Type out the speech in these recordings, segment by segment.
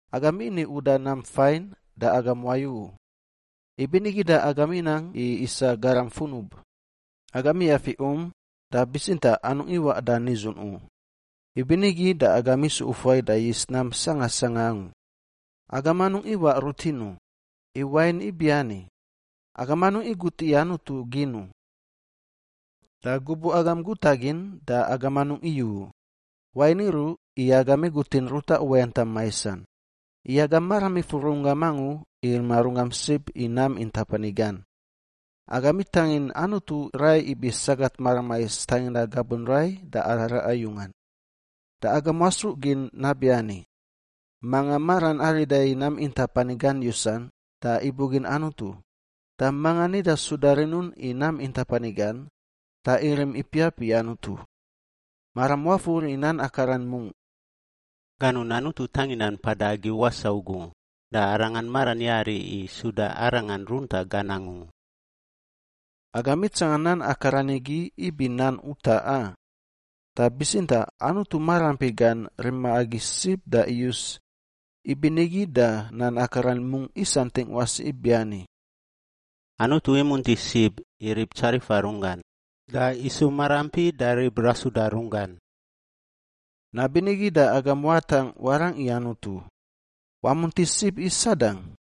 Agam ini uda nam fain da agam wayu u; ibinigi da agam inang i isa garam funub. Agam iyafi um, da bitsintaꞌ anungꞌ iwaꞌ da nidzun u; ibinigi da agam isu ufuai da yis nam sanga sanga angu. Agam anungꞌ iwaꞌ rutin u, i wain ibiani: agam anungꞌ igut i Anutu gin u. Da gubuꞌ agam guta gin da agam anungꞌ iyu u, wain iruꞌ i agam igutin ruta uwayantam maisan. I agam maram ifur runggam angu i rima runggam sib i nam intap ani gan. Agam itangin Anutu rai ibi sagat maramais tanginda gabun rai da araraꞌa yungan. Da agam wasruꞌ gin nabiani, manga maran arida i nam intap ani gan yusan, da ibugin Anutu. Da mangan nida suda rinun i nam intap ani gan, da irim ipiap i Anutu. Maram wafur i nan akaran mungꞌ, “Ganun Anutu tangindan mpada agi wasaꞌ ugu da Arangan maran yari i suda Arangan runtaꞌ gan angu.” Agam itsanga nan akaran igi ibi nan utaꞌ, a? Da bitsintaꞌ Anutu maraampi gan rima agi sib da iyus; ibinigi da nan akaran mungꞌ isantingꞌ wasi ibiani, “Anutu imunti sib i rib tsarifa runggan da isu maraampi da rib rasuda runggan.” Nabinigi da agam watangꞌ warangꞌ i Anutu. Wamunti sib i Sadang,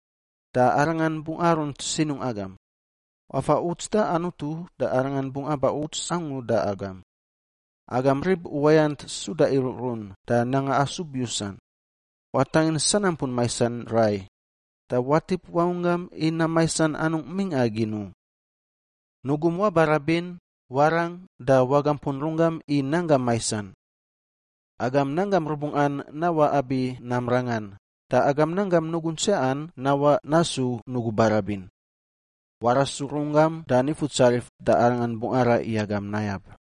da arangan bungꞌ arunt sinungꞌ agam. Wafa uts da Anutu da Arangan bungꞌ aba uts angu da agam. Agam rib uwayant suda iruꞌrun da nanga asub yusan, watangin sanampun maisan rai da watip wangunggam i nam maisan anungꞌ mingꞌa gin u. Nugum wabarabin, warang, da wagampun runggam i nanggam maisan. Agam nanggam rubungꞌan nawaꞌ abi nam rangan da nanggam nugun tsiaꞌan nawaꞌ nasu nugu barabin. Warasu runggam da Nifutsarif da Arangan bungꞌ araꞌ i agam nayab.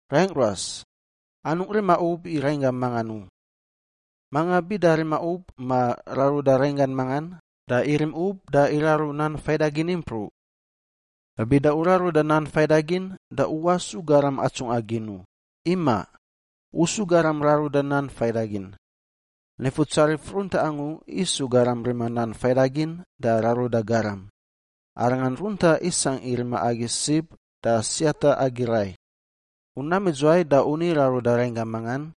Raingꞌ ruas, anungꞌ rima ub i rainggam mangan u. Manga bida rima ub ma raruda rainggan mangan, da irim ub da iraru Nan Faidagin impruꞌ. Da bida u raruda Nan Faidagin da u wasu garam atsungꞌa gin u. Imaꞌ! U su garam raruda Nan Faidagin. Nifutsarif runtaꞌ angu isu garam rima Nan Faidagin da raruda garam. Arangan runtaꞌ isangꞌ i rima agi sib da siata agi rai. U nam idzuwai da u ni raruda rainggam mangan?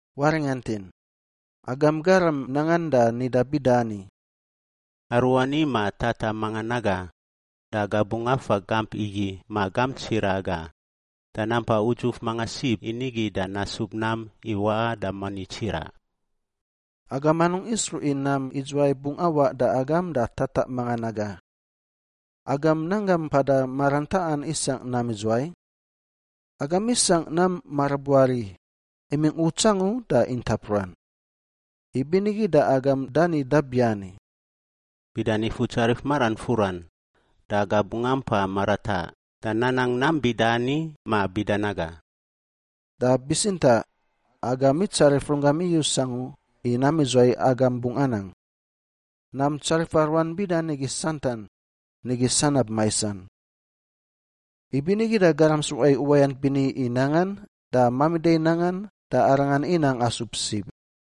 Waringantin, agam garam nangan da nida bida ani, “Aruani ma tataꞌ mangan naga da aga bungꞌ afa gamp igi ma gamp tsiraꞌ aga, da nampa udzuf manga sib i nigi da nasub nam i waꞌa da moni tsiraꞌ.” Agam anungꞌ isruꞌ i nam idzuwai bungꞌ awaꞌ da agam da tataꞌ mangan naga. Agam nanggam mpada maran taꞌan isangꞌ nam idzuwai? Agam isangꞌ nam marabuari, imingꞌ uts angu da intap ruan. Ibinigi da agam dani dabiani, “Bida Nifutsarif maran furan, da aga bungꞌ ampa marataꞌ da nanang nam bida ani ma bida naga.” Da bitsintaꞌ, agam itsarif runggam iyus angu i nam idzuwai agam bungꞌ anang. Nam tsarifa ruan bida nigi santan, nigi sanab maisan. Ibinigi da garam sruꞌa i uwayant bini i nangan, da mamida i nangan, da arangan inang asub sib.